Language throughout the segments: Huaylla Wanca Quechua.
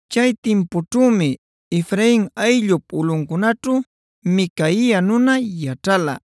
Chay timpućhümi Efrain ayllup ulꞌuncunaćhu Micaia nuna yaćhala.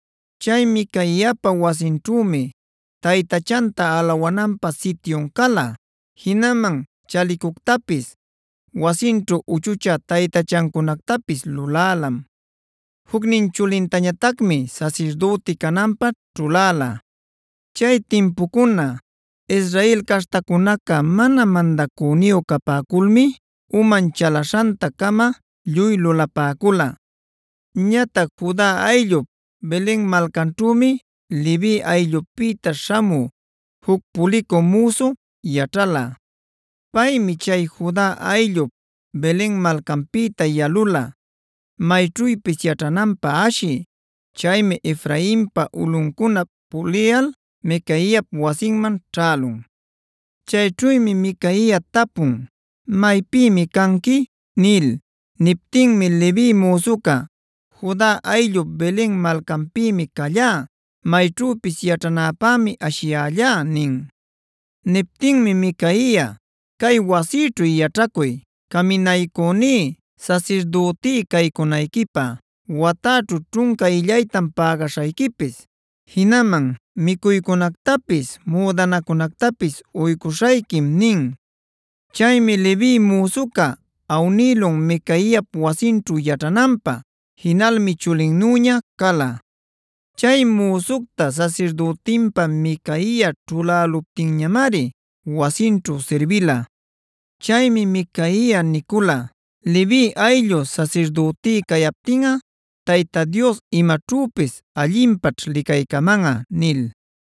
Chay Micaiapa wasinćhümi taytachanta alawananpä sityun cala. Jinaman chalicuctapis, wasinćhu uchuchä taytachacunactapis lulälam. Jucnin chulintañatacmi sasirdüti cananpä ćhuläla. Chay timpucuná Israel caśhtacunaca mana mandacüniyu capäculmi uman chalaśhanta-cama lluy lulapäcula. a Ñatac Juda ayllup Belen malcanćhümi Levi ayllupïta śhamü juc pulicü müsu yaćhala. Paymi chay Juda ayllup Belen malcanpïta yalula mayćhüpis yaćhananpä ashï. Chaymi Efrainpa ulꞌuncunap puliyal Micaiap wasinman ćhälun. Chayćhümi Micaia tapun: “¿Maypïmi canqui?” nil. Niptinmi Levi müsuca: “Juda ayllup Belen malcanpïmi callá; mayćhüpis yaćhanäpämi ashiyällá” nin. Niptinmi Micaia: “Cay wasïćhu yaćhacuy, caminaycüní, sasirdütí caycunayquipä. Watäćhu ćhunca illaytam pägaśhayquipis; jinaman micuycunactapis müdanacunactapis uycuśhayquim” nin. Chaymi Levi müsuca awnïlun Micaiap wasinćhu yaćhananpä; jinalmi chulinnüña cala. Chay müsucta sasirdütinpä Micaia ćhuläluptinñamari wasinćhu sirbila. Chaymi Micaia nicula: “Levi ayllu sasirdütí cayaptinꞌa Tayta Dios imaćhüpis allinpaćh licaycamanꞌa” nil.